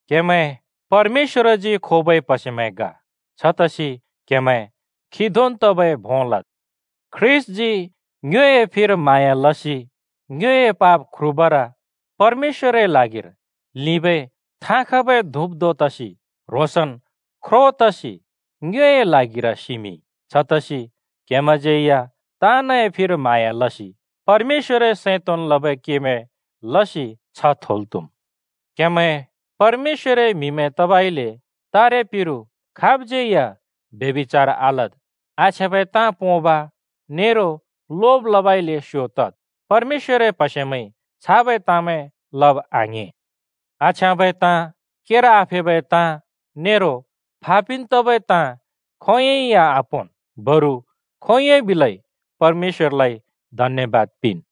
क्हेमैं परमेश्‍वरजी खोबै प्‍हसेमैं ग, छतसि क्‍हेमैं खी धोंन् तबै भों लद्। ख्रीष्‍टजी ङ्योए फिर म्हाँया लसि ङ्योए पाप ख्रुबर परमेश्‍वरए ल्हागिर लिंबै थाँ खबै धुप धों तसि ह्रोंसन् ख्रो तसि ङ्योए ल्हागिर सिमिंइ। छतसि क्‍हेमैंज्यै या ताँनए फिर म्हाँया लसि परमेश्‍वरए सैं तोंन् लबै केमैं लसि छ्ह थोल् त्हुम्। क्‍हेमैं परमेश्‍वरए म्‍हिमैं तबइले तारेपिरु खाबज्यै या ब्यभिचार आलद्, आछ्याँबै ताँ पोंब नेरो लोब लबउँइँले स्‍यो तद्। परमेश्‍वरए प्हसेमैंइ छाबै ताँमैं लब आङ्‍हें। आछ्याँबै ताँ, केर आफेबै ताँ, नेरो फा पिन् तबै ताँ खोंयोंइ या आपोंन्। बरु खोंयोंन् बिलै परमेश्‍वरलाइ धन्‍यबाद पिंन्।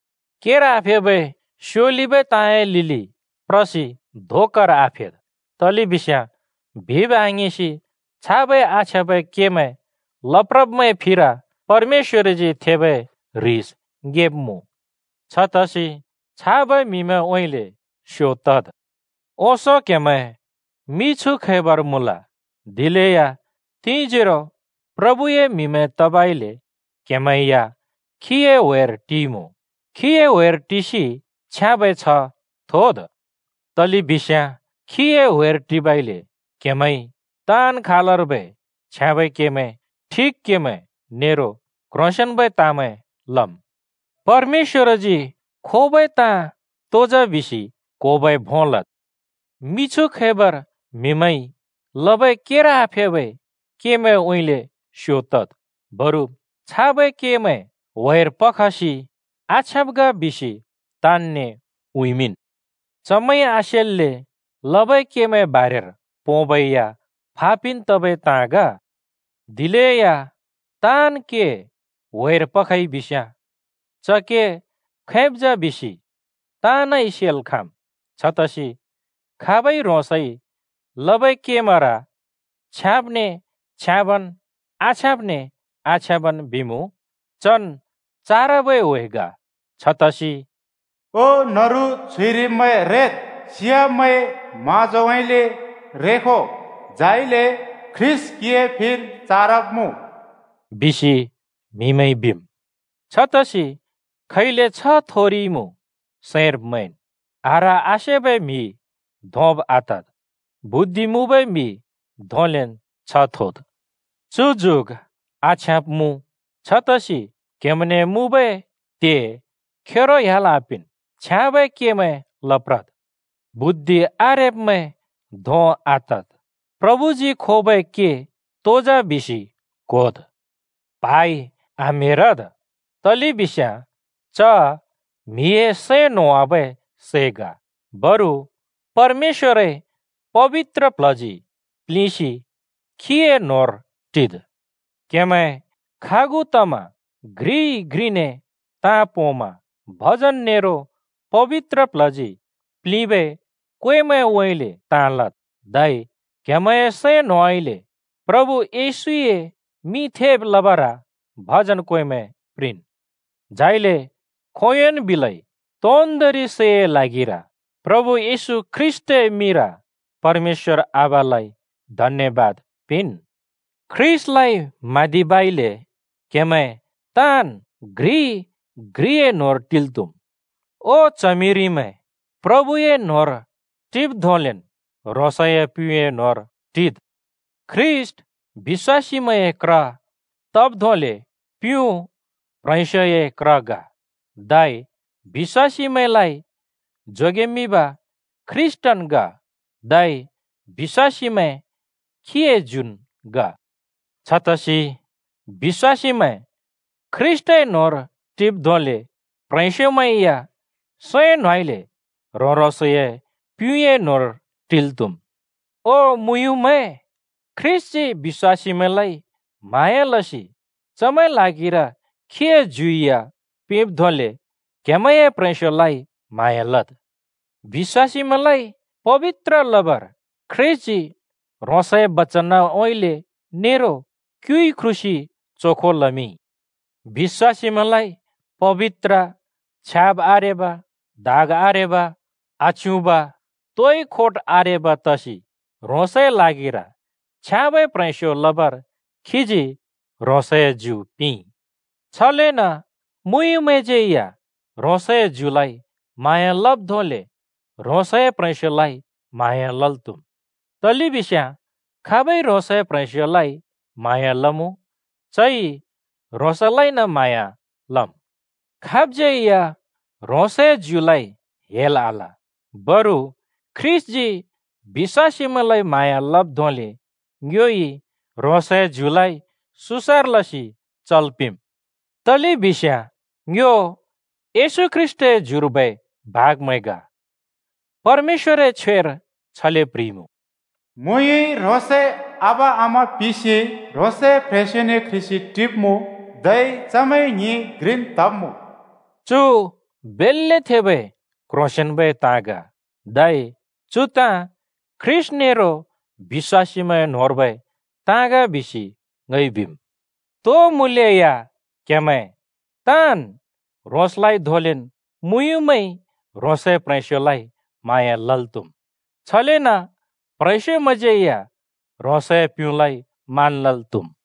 केर आफेबै स्योलिबै ताँए लिलि प्रसि धोकार आफेद्। तलेबिस्याँ बिब् आङिंसि छाबै आछ्याँबै केमैं लप्रब्मैंए फिर परमेश्‍वरजी थेबै ह्रिस ङेब्‍मुँ। छतसि छाबै म्‍हिमैंउँइँले स्यो तद्। ओंसों क्हेमैं मिछु खैबर मुँल, दिलेया तिंजोरो प्रभुए म्‍हिमैं तबइले क्‍हेमैं या खीए ह्‍वेर टिइमुँ। खीए ह्‍वेर टिसि छ्याँबै छ्ह थोद्। तलेबिस्याँ खीए ह्‍वेर टिबइले क्हेमैंइ ताँन् खालर्बै छ्याँबै केमैं, ठिक केमैं, नेरो क्ह्रोंसेंन्बै ताँमैं लम्। परमेश्‍वरजी खोबै ताँ तो जा बिसि क्होबै भों लद्। मिछु खैबर म्हिमैंइ लबै केर आफेबै केमैंउँइँले स्‍यो तद्, बरु छाबै केमैं ह्‍वेर पसि आछ्याँब ग बिसि ताँनने उँइँमिंन्। (चमैंइ आसेल्‍ले लबै केमैंए बारेर पोंबै या फा पिन् तबै ताँ ग।) दिलेया ताँन् के ह्‍वेर पइ बिस्‍याँ च के खैब जा बिसि ताँनइ सेल् खाँम्। छतसि खाबइ ह्रोंसइ लबै केमैंर छ्याँबने छ्याँबन् आछ्याँबने आछ्याँबन् बिमुँ चन् चारबै ह्‍वे ग। छतसि “ओ न्‍हरु च्हुइरिब्‍मैं रेद्, सियाब्मैंए म्हाँजोउँइँले रेखो! झाइले ख्रीष्‍ट क्‍हिए फिर चारब्‍मुँ,” बिसि म्हिमैंइ बिम्। छतसि खैले छ्ह थोरिइमुँ सैंर मैंन्, आह्र-आसेबै म्हि धोंब आतद्, बुद्धि मुँबै म्हि धोंलेन् छ्ह थोद्। चु जुग आछ्याँब मुँ। छतसि क्‍हेमैंने मुँबै त्हे खेरो ह्‍याल् आपिंन्, छ्याँबै केमैं लप्रद्। बुद्धि आरेब्‍मैं धों आतद्, प्रभुजी खोबै के तो जा बिसि क्‍होद्। प्हाइ आम्हेरद्, तलेबिस्याँ च म्हिए सैं न्होवाबै सै ग। बरु परमेश्‍वरए पबित्र प्ल्हजी प्लिंसि खीए न्होंर टिद्। क्हेमैं खागु तमा घ्रिइ घ्रिने ताँ पोंमा भजन नेरो पबित्र प्ल्हजी पिंबै क्वेमैंउँइँले ताँ लद्; धै क्‍हेमैंए सैं न्होंउँइँले प्रभु येशूए मिं थेब् लबर भजन क्वेमैं प्रिंन्। झाइले खोंयोंन् बिलै तोन्दोंरि सैए ल्हागिर प्रभु येशू ख्रीष्‍टए मिंर परमेश्‍वर आबालाइ धन्‍यबाद पिंन्। ख्रीष्‍टलाइ म्हाँदिबइले क्‍हेमैं ताँन् घ्रि घ्रिए न्होंर टिल् त्‍हुम्। ओ च्हमिरिमैं, प्रभुए न्होंर टिब् धोंलेन् ह्रोंसए प्‍युँए न्होंर टिद्। ख्रीष्‍ट बिश्‍वासीमैंए क्र तब् धोंले प्युँ प्‍ह्रेंस्‍योए क्र ग। धै बिश्‍वासीमैंलाइ जोगेमिंब ख्रीष्‍टन् ग, धै बिश्‍वासीमैं खीए ज्युन् ग। छतसि बिश्‍वासीमैं ख्रीष्‍टए न्होंर टिब् धोंले प्‍ह्रेंस्‍योमैं या सैं न्होंउँइँले ह्रों-ह्रोंसए प्‍युँए न्होंर टिल् त्‍हुम्। ओ मुँयुँमैं, ख्रीष्‍टजी बिश्‍वासीमैंलाइ म्हाँया लसि चमैंए ल्हागिर खीए ज्यु या पिंब् धोंले क्‍हेमैंए प्‍ह्रेंस्‍योलाइ म्हाँया लद्। बिश्‍वासीमैंलाइ पबित्र लबर ख्रीष्‍टजी ह्रोंसए बचनउँइँले नेरो क्युइ ख्रुसि चोखो लमिंइ। बिश्‍वासीमैंलाइ पबित्र, छ्याब् आरेब, दाग आरेब, आच्युँब, तोइ खोट आरेब तसि ह्रोंसए ल्हागिर छ्याँबै प्ह्रेंस्यो लबर खीजी ह्रोंसए ज्यु पिंइ। छलेन मुँयुँमैंज्यै या ह्रोंसए ज्युलाइ म्हाँया लब् धोंले ह्रोंसए प्‍ह्रेंस्‍योलाइ म्हाँया लल् त्‍हुम्, तलेबिस्याँ खाबइ ह्रोंसए प्‍ह्रेंस्‍योलाइ म्हाँया लमुँ, चइ ह्रोंसलाइन म्हाँया लम्। (खाबज्यै या ह्रोंसए ज्युलाइ हेल आल, बरु ख्रीष्‍टजी बिश्‍वासीमैंलाइ म्हाँया लब् धोंले ङ्योइ ह्रोंसए ज्युलाइ सुसर लसि चल् पिंम्। तलेबिस्याँ ङ्यो येशू ख्रीष्‍टए ज्युर्बै भागमैं ग।) परमेश्‍वरए छ्वेर छले प्ह्रिइमुँ: “मुँयुँइ ह्रोंसए आबा-आमा पिसि ह्रोंसए प्‍ह्रेंस्‍योने क्ह्रिसि टिब्मुँ, धै चमैं ङ्हिं घ्रिन् तब्‍मुँ।” चुर बेल्‍ले थेबै क्‍ह्रोंसेंन्‍बै ताँ ग। धै चु ताँ ख्रीष्‍ट नेरो बिश्‍वासीमैंए न्होंर्बै ताँ ग बिसि ङइ बिम। तो मुलेया क्‍हेमैं ताँन् ह्रोंसलाइ धोंलेन् मुँयुँमैंइ ह्रोंसए प्‍ह्रेंस्‍योलाइ म्हाँया लल् त्‍हुम्, छलेन प्ह्रेंस्योमैंज्यै या ह्रोंसए प्‍युँलाइ मान लल् त्‍हुम्।